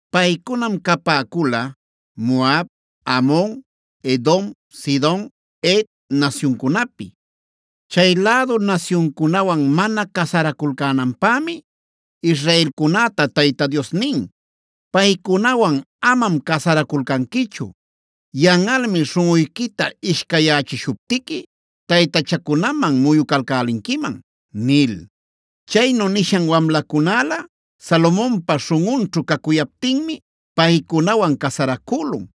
Paycunam capäcula Moab, Amon, Edom, Sidon, Het nasyuncunapi. Chay lädu nasyuncunawan mana casaraculcänanpämi israelcunäta Tayta Dios nin: “Paycunawan amam casaraculcanquichu. Yanꞌalmi śhunꞌuyquita ishcayyächishuptiqui taytachancunaman muyucalcälinquiman” nil.b Chaynu nishan wamlacunälä Salomonpa śhunꞌunćhu cacuyaptinmi paycunawan casaracülun.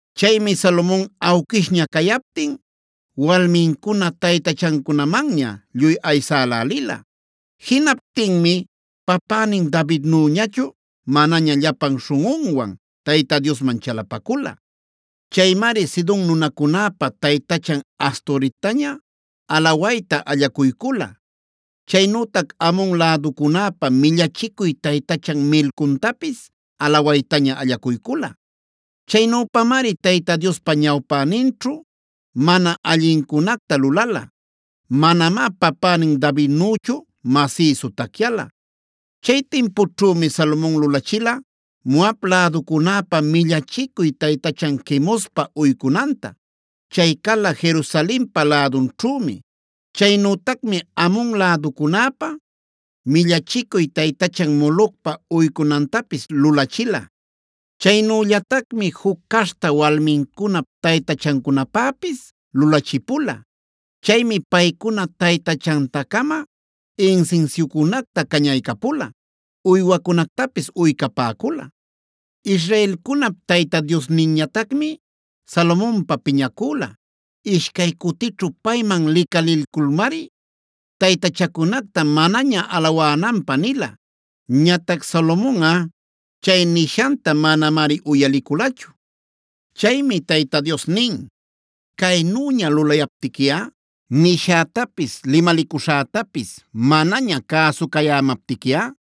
Chaymi Salomon awquishña cayaptin walmincuna taytachancunamanña lluy aysälälila. Jinaptinmi papänin Davidnüñachu manaña llapan śhunꞌunwan Tayta Diosman chalapacula. Chaymari Sidon nunacunäpa taytachan Astorettañad alawayta allacuycula. Chaynütac Amon läducunäpa millachicuy taytachan Milcomtapisc alawaytaña allacuycula. Chaynüpamari Tayta Diospa ñawpäninćhu mana allincunacta lulala. Manamá papänin Davidnüchu masïsu tacyala. Chay timpućhümi Salomon lulachila Moab läducunäpa millachicuy taytachan Quemospa uycunanta. Chay cala Jerusalenpa lädunćhümi. Chaynütacmi Amon läducunäpa millachicuy taytachan Molocpa uycunantapis lulachila. Chaynüllatacmi juc caśhta walmincunap taytachancunapäpis lulachipula. Chaymi paycuna taytachanta-cama insinsiucunacta cañaycapula, uywacunactapis uycapäcula. Israelcunap Tayta Diosninñatacmi Salomonpä piñacüla. Ishcay cutićhu payman licalilculmari, taytachacunacta manaña alawänanpä nila. Ñatac Salomonꞌa chay nishanta manamari uyaliculachu. Chaymi Tayta Dios nin: “Caynüña lulayaptiquiꞌa, nishätapis limalicuśhätapis manaña cäsucayämaptiquiꞌa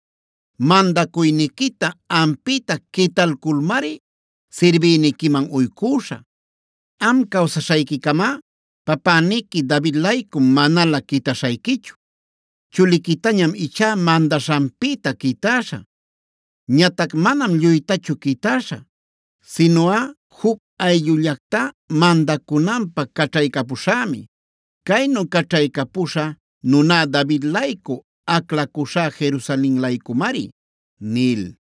mandacuyniquita ampïta quitalculmari sirbïniquiman uycüśhä. Am cawsaśhayquicamá papäniqui David-laycum manalä quitaśhayquichu. Chuliquitañam ichá mandaśhanpïta quitäśhä. Ñatac manam lluytachu quitäśhä; sinuꞌa juc ayllullactá mandacunanpä caćhaycapuśhämi. Caynu caćhaycapuśha nuná David-laycu, aclacuśhá Jerusalen-laycumari” nil.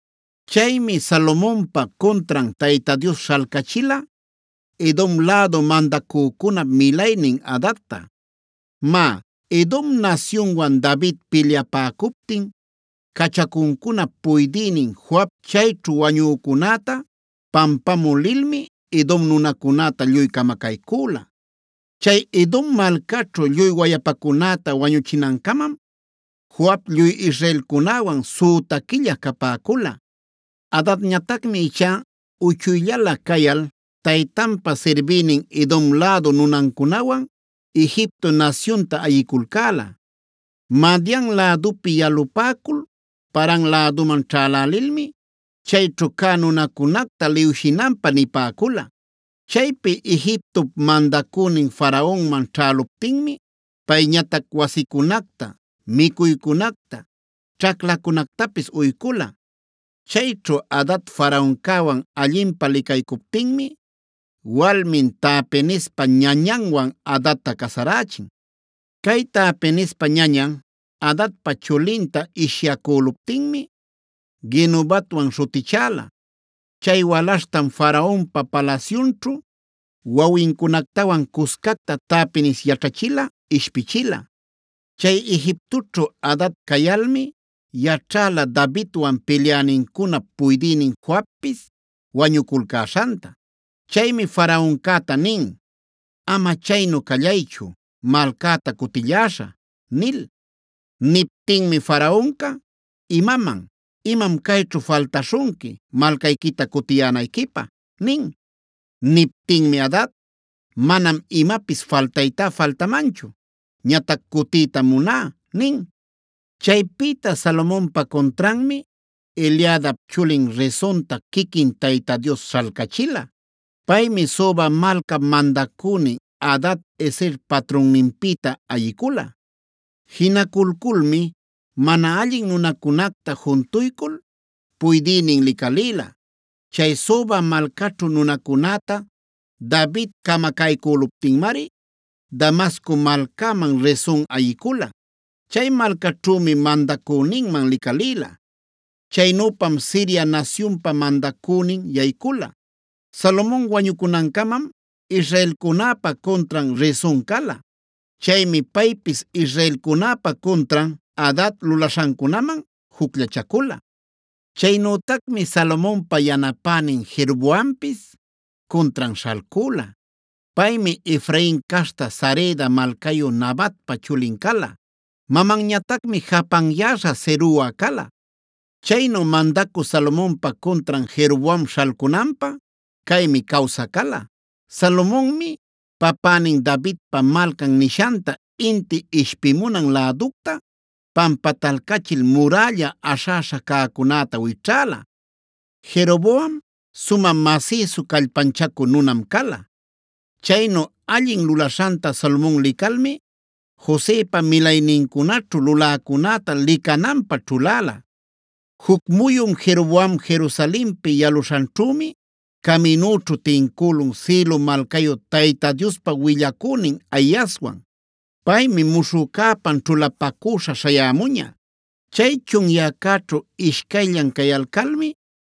Chaymi Salomonpa cuntran Tayta Dios śhalcachila Edom lädu mandacücunap milaynin Hadadta. Má, Edom nasyunwan David pilyapäcuptin cachacuncunap puydïnin Joab chayćhu wañücunäta pampamü lilmi Edom nunacunäta lluy camacaycüla. (Chay Edom malcaćhu lluy wayapacunäta wañuchinancamam Joab lluy israelcunäwan süta quilla capäcula.) Hadadñatacmi ichá uchuyllala cayal taytanpa sirbïnin Edom lädu nunancunawan Egipto nasyunta ayiculcäla. Madian lädupi yalapäcul Paran läduman ćhälälilmi chayćhu cä nunacunacta liwshinanpä nipäcula. Chaypi Egiptop mandacünin Faraonman ćhäluptinmi payñatac wasicunacta, micuycunacta, ćhaclacunactapis uycula. Chayćhu Hadad Faraoncäwan allinpä licaycuptinmi walmin Tahpenespa ñañanwan Hadadta casarächin. Cay Tahpenespa ñañan Hadadpa chulinta ishyacüluptinmi Genubatwan śhutichäla. Chay walaśhtam Faraonpa palasyunćhu wawincunactawan cuscacta Tahpenes yaćhachila, ishpichila. Chay Egiptoćhu Hadad cayalmi yaćhäla Davidwan pilyänincunap puydïnin Joabpis wañuculcäśhanta. Chaymi Faraoncäta nin: “Ama chaynu callaychu, malcäta cutïlläśhä” nil. Niptinmi Faraonca: “¿Imaman? ¿Imam cayćhu faltaśhunqui malcayquita cutiyänayquipä?” nin. Niptinmi Hadad: “Manam imapis faltaytá faltamanchu. Ñatac cutïtam muná” nin. Chaypïta Salomonpa cuntranmi Eliadap chulin Rezonta quiquin Tayta Dios śhalcachila. Paymi Soba malcap mandacünin Hadad-ezer patrunninpïta ayicula. Jinaculculmi mana allin nunacunacta juntuycul puydïnin licalïla. Chay Soba malcaćhu nunacunäta David camacaycüluptinmari Damasco malcäman Rezon ayicula. Chay malcaćhümi mandacüninman licalïla. Chaynüpam Siria nasyunpa mandacünin yaycula. Salomon wañucunancamam israelcunäpa cuntran Rezon cala. Chaymi paypis israelcunäpa cuntran Hadad lulaśhancunaman jucllachacula. Chaynütacmi Salomonpa yanapänin Jeroboampis cuntran śhalcüla. Paymi Efrain caśhta Sareda malcayu Nabatpa chulin cala. Mamanñatacmi japanyäśha Zerua cala. Chaynu mandacü Salomonpa cuntran Jeroboam śhalcunanpä caymi cawsä cala: Salomonmi papänin Davidpa Malcan nishanta inti ishpimunan läducta pampatalcachil murälla aśhäśha cäcunäta wićhäla. Jeroboam sumä masïsu callpanchacü nunam cala. Chaynu allin lulaśhanta Salomon licalmi Josepa milaynincunaćhue luläcunäta licananpä ćhuläla. Juc muyun Jeroboam Jerusalenpi yalüśhanćhümi caminüćhu tincülun Silo malcayu Tayta Diospa willacünin Ahiaswan. Paymi muśhü cäpan ćhulapacüśha śhayämuña. Chay chunyäcäćhu ishcayllan cayalcalmi,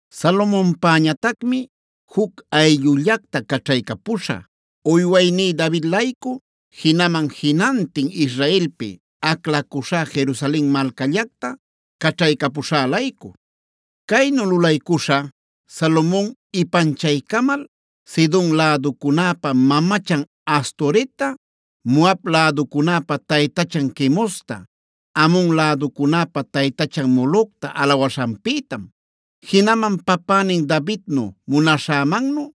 Salomonpäñatacmi juc ayllullacta caćhaycapuśhä, uywayní David-laycu jinaman jinantin Israelpi aclacuśhá Jerusalen malcallacta caćhaycapuśhä-laycu. Caynu lulaycuśhä Salomon ipanchaycamal Sidon läducunäpa mamachan Astoretta, Moab läducunäpa taytachan Quemosta, Amon läducunäpa taytachan Molocta alawaśhanpïtam. Jinaman papänin Davidnu munaśhämannu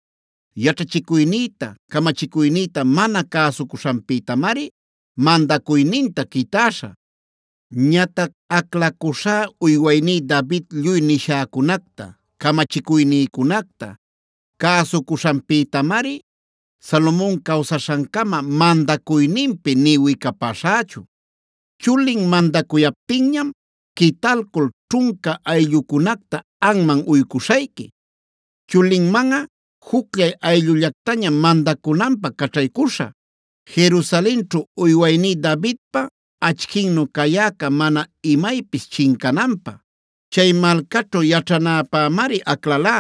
yaćhachicuynïta, camachicuynïta mana cäsucuśhanpïtamari mandacuyninta quitäśhä. Ñatac aclacuśhä uywayní David lluy nishäcunacta, camachicuynïcunacta cäsucuśhanpïtamari Salomon cawsaśhancama mandacuyninpi nï wicapaśhächu. Chulin mandacuyaptinñam quitalcul ćhunca ayllucunacta anman uycuśhayqui. Chulinmanꞌa jucllay ayllullactañam mandacunanpä caćhaycuśhä, Jerusalenćhu uywayní Davidpa achquinnu cayäca mana imaypis chincananpä. Chay malcaćhu yaćhanäpämari aclalá.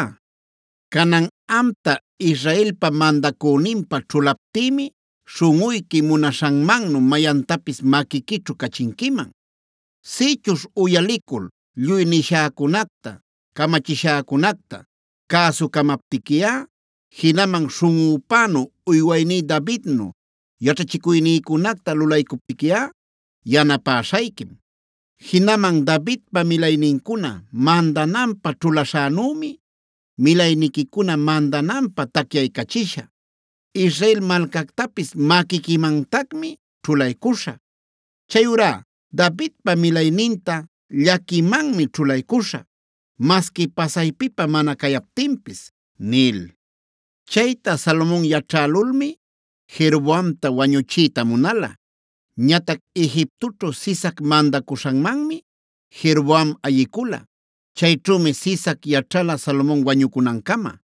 “ ‘Canan amta Israelpa mandacüninpä ćhulaptïmi śhunꞌuyqui munaśhanmannu mayantapis maquiquićhu cachinquiman. Sïchuśh uyalicul lluy nishäcunacta, camachiśhäcunacta cäsucamaptiquiꞌa, jinaman śhunꞌüpänu uywayní Davidnu yaćhachicuynïcunacta lulaycuptiquiꞌa yanapäśhayquim. Jinaman Davidpa milaynincuna mandananpä ćhulaśhänümi milayniquicuna mandananpä tacyaycachishä. Israel malcactapis maquiquimantacmi ćhulaycuśhä. Chayurá Davidpa milayninta llaquimanmi ćhulaycuśhä, masqui pasaypipä mana cayaptinpis’” nil. Chayta Salomon yaćhälulmi Jeroboamta wañuchiyta munala. Ñatac Egiptoćhu Sisac mandacuśhanmanmi Jeroboam ayicula. Chayćhümi Sisac yaćhala Salomon wañucunancama.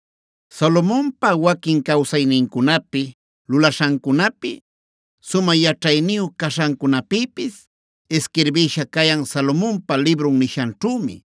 Salomonpa waquin cawsaynincunapi, lulaśhancunapi, sumä yaćhayniyu caśhancunapïpis isquirbïsha cayan Salomonpa librun nishanćhümi.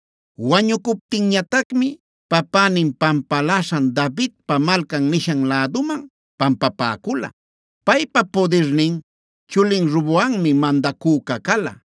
Wañucuptinñatacmi papänin pampaläśhan Davidpa Malcan nishan läduman pampapäcula. Paypa pudirnin chulin Roboammi mandacüca cala.